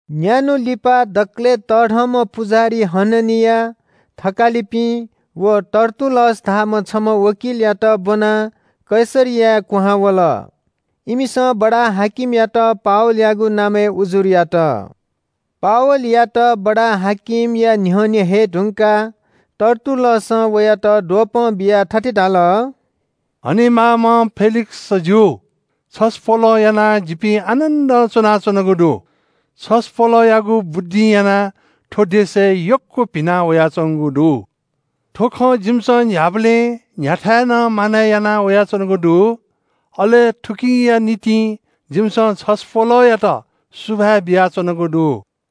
न्‍यान्‍हु लिपा दकलय् तःधंम्‍ह पुजाहारी हननिया, थकालिपिं व तर्तुल्‍लस धाःम्‍ह छम्‍ह वकिलयात ब्‍वनाः कैसरियाय् क्‍वहां वल। इमिसं बडा-हाकिमयात पावलयागु नामय् उजुर यात। पावलयात बडा-हाकिमया न्‍ह्यःने हये धुंकाः तर्तुल्‍लसं वयात द्वपं बियाः थथे धाल – “हनेमाःम्‍ह फेलिक्‍सजु, छसपोलं यानाः जिपिं आनन्‍दं च्‍वनाच्‍वनागु दु। छसपोलयागु बुद्धिं यानाः थ्‍व देशय् यक्‍व भिना वयाच्‍वंगु दु। थ्‍व खँ जिमिसं न्‍ह्याबलें न्‍ह्याथाय् नं मानय् याना वयाच्‍वनागु दु। अले थुकिया निंतिं जिमिसं छसपोलयात सुभाय् बियाच्‍वनागु दु।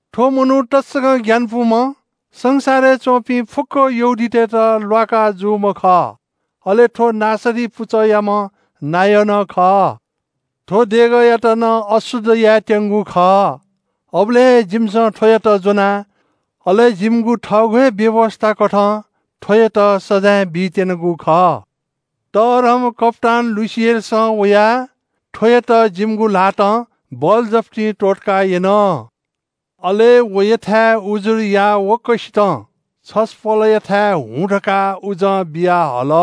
थ्‍व मनू तसकं ग्‍यानापुम्‍ह, संसारय् च्‍वंपिं फुक्‍क यहूदीतय्‌त ल्‍वाका जूम्‍ह खः। अले थ्‍व नासरी पुचःयाम्‍ह नायः नं खः। थ्‍वं देगःयात नं अशुद्ध यायेत्‍यंगु खः, अबलय् हे जिमिसं थ्‍वयात ज्‍वना। अले जिमिगु थःगु हे व्‍यवस्‍थाकथं थ्‍वयात सजाँय बीत्‍यनागु खः। तःधंम्‍ह कप्‍तान लुसियसं वयाः थ्‍वयात जिमिगु ल्‍हातं बलजफ्ती त्‍वःतका यन। अले वयाथाय् उजुर याःवंक्‍वसित छसपोलयाथाय् हुँ धकाः उजं बियाहल।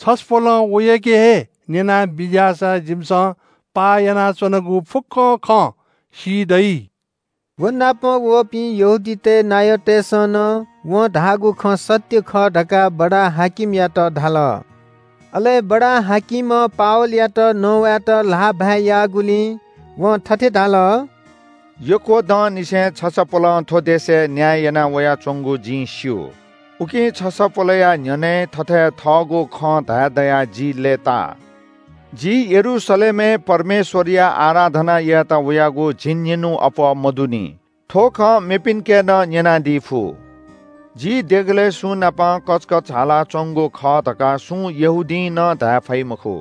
छसपोलं वयाके हे न्‍यनाबिज्‍याःसा जिमिसं पाः यानाच्‍वनागु फुक्‍क खँ सी दइ।” व नाप वःपिं यहूदीतय् नायःतय्‌सं नं वं धाःगु खँ सत्‍य खः धकाः बडा-हाकिमयात धाल। अले बडा-हाकिमं पावलयात नवायेत ल्‍हाःभाय् याःगुलिं वं थथे धाल – “यक्‍व दंनिसें छसपोलं थ्‍व देशय् न्‍याय याना वयाच्‍वंगु जिं स्‍यू। उकिं छसपोलया न्‍ह्यःने थथे थःगु खँ धाये दयाः जि लय्‌ता। जि यरूशलेमय् परमेश्‍वरया आराधना यायेत वयागु झिंनिन्‍हुं अप्‍वः मदुनि। थ्‍व खँ मेपिन्‍के नं न्‍यनादी फु। जि देगलय् सुंनाप कचकच हालाच्‍वंगु खः धकाः सुं यहूदीं नं धाये फइ मखु।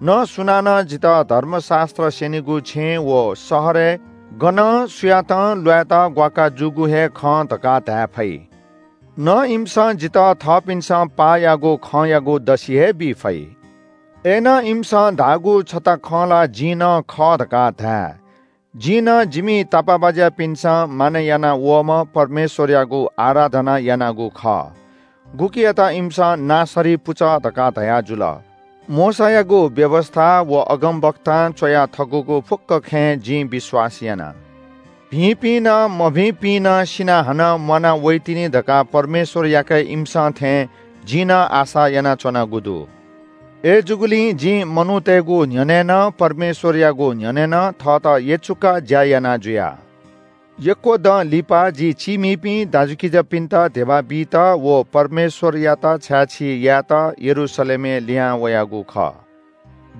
न सुनानं जितः धर्मशास्‍त्र स्‍यनिगु छेँय् व शहरय् गनं सुयातं ल्‍वायेत ग्‍वाकाः जूगु हे खं धकाः धाये फइ। न इमिसं जितः थःपिन्‍सं पाः याःगु खँयागु दसि हे बी फइ। “अय्‌नं इमिसं धाःगु छता खँ ला जिं नं खः धकाः धाये। जिं नं जिमि तापाःबाज्‍यापिन्‍सं मानय् याना वःम्‍ह परमेश्‍वरयागु आराधना यानागु खः, गुकियात इमिसं ‘नासरी पुचः’ धकाः धयाजुल। मोशायागु व्‍यवस्‍था व अगमवक्तां च्‍वया थकूगु फुक्‍क खँय् जिं विश्‍वास याना। भिंपिं नं मभिंपिं नं सिनाः हानं म्‍वाना वइतिनि धकाः परमेश्‍वरयाके इमिसं थें जिं नं आशा यानाच्‍वनागु दु। अय्‌जूगुलिं जिं मनूतय्‌गु न्‍ह्यःने नं परमेश्‍वरयागु न्‍ह्यःने नं थःत यचुकाः ज्‍या याना जुया।” “यक्‍व दँ लिपा जि चीमिपिं दाजुकिजापिन्‍त धिबा बीत व परमेश्‍वरयात छाय्‌छी यायेत यरूशलेमय् लिहां वयागु खः।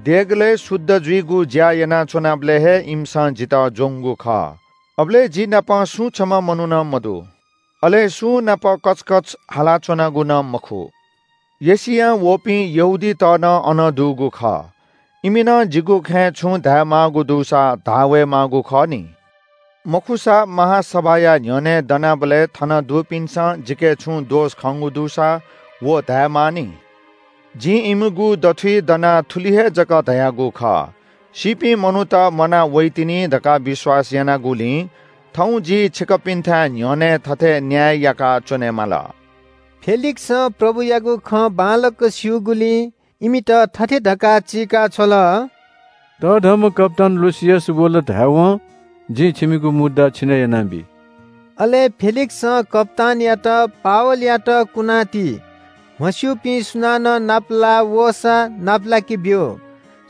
देगलय् शुद्ध जुइगु ज्‍या यानाच्‍वनाबलय् हे इमिसं जितः ज्‍वंगु खः। अबलय् जि नाप सुं छम्‍ह मनू नं मदु। अले सुंनाप कचकच हालाच्‍वनागु नं मखु। एशियां वःपिं यहूदीत नं अन दुगु खः, इमि नं जिगु खँय् छुं धायेमाःगु दुसा धाः वये माःगु खः नि। मखुसा महासभाया न्‍ह्यःने दनाबलय् थन दुपिन्‍सं जिके छुं दोष खंगु दुसा व धायेमानि। जिं इमिगु दथुइ दनाः थुलि हे जक धयागु खः – ‘सीपिं मनूत म्‍वाना वइतिनि धकाः विश्‍वास यानागुलिं थौं जि छिकपिन्‍थाय् न्‍ह्यःने थथे न्‍याय याका च्‍वनेमाल।’” फेलिक्‍सं प्रभुयागु खँ बांलाक स्‍यूगुलिं इमित थथे धकाः चीकाछ्वल – “तःधंम्‍ह कप्‍तान लुसियस वल धायेवं जिं छिमिगु मुद्दा छिने यानाबी।” अले फेलिक्‍सं कप्‍तानयात “पावलयात कुना ति, म्‍हस्‍यूपिं सुनानं नापलाः वःसा नापलाके ब्‍यु।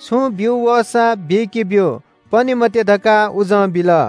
छुं ब्‍यू वःसा बीके ब्‍यु, पने मते” धकाः उजं बिल।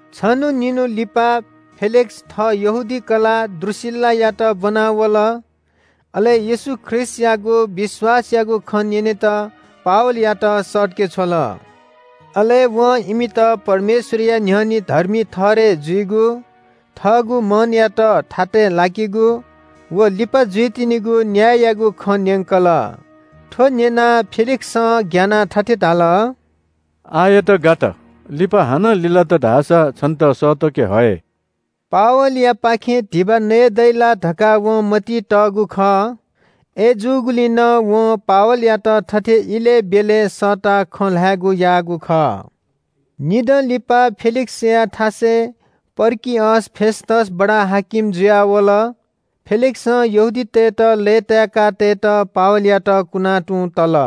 छन्‍हु निन्‍हु लिपा फेलिक्‍स थः यहूदी कलाः द्रूसिल्‍लायात ब्‍वनाः वल। अले येशू ख्रीष्‍टयागु विश्‍वासयागु खँ न्‍यनेत पावलयात सःतके छ्वल। अले वं इमित परमेश्‍वरया न्‍ह्यःने धर्मी ठहरय् जुइगु, थःगु मनयात थातय् लाकेगु व लिपा जुइतिनिगु न्‍याययागु खँ न्‍यंकल। थ्‍व न्‍यनाः फेलिक्‍सं ग्‍यानाः थथे धाल – “आःयात गात, लिपा हानं लिलात धाःसा छन्‍त सःतके हये।” पावलयापाखें धिबा नयेदइ ला धकाः वं मतिइ तःगु खः। अय्‌जूगुलिं नं वं पावलयात थथे इलय् ब्‍यलय् सःताः खँ ल्‍हायेगु याःगु खः। निदँ लिपा फेलिक्‍सया थासय् पर्किअस फेस्‍तस बडा-हाकिम जुयाः वल। फेलिक्‍सं यहूदीतय्‌त लय्‌ताय्‌का तयेत पावलयात कुना तुं तल।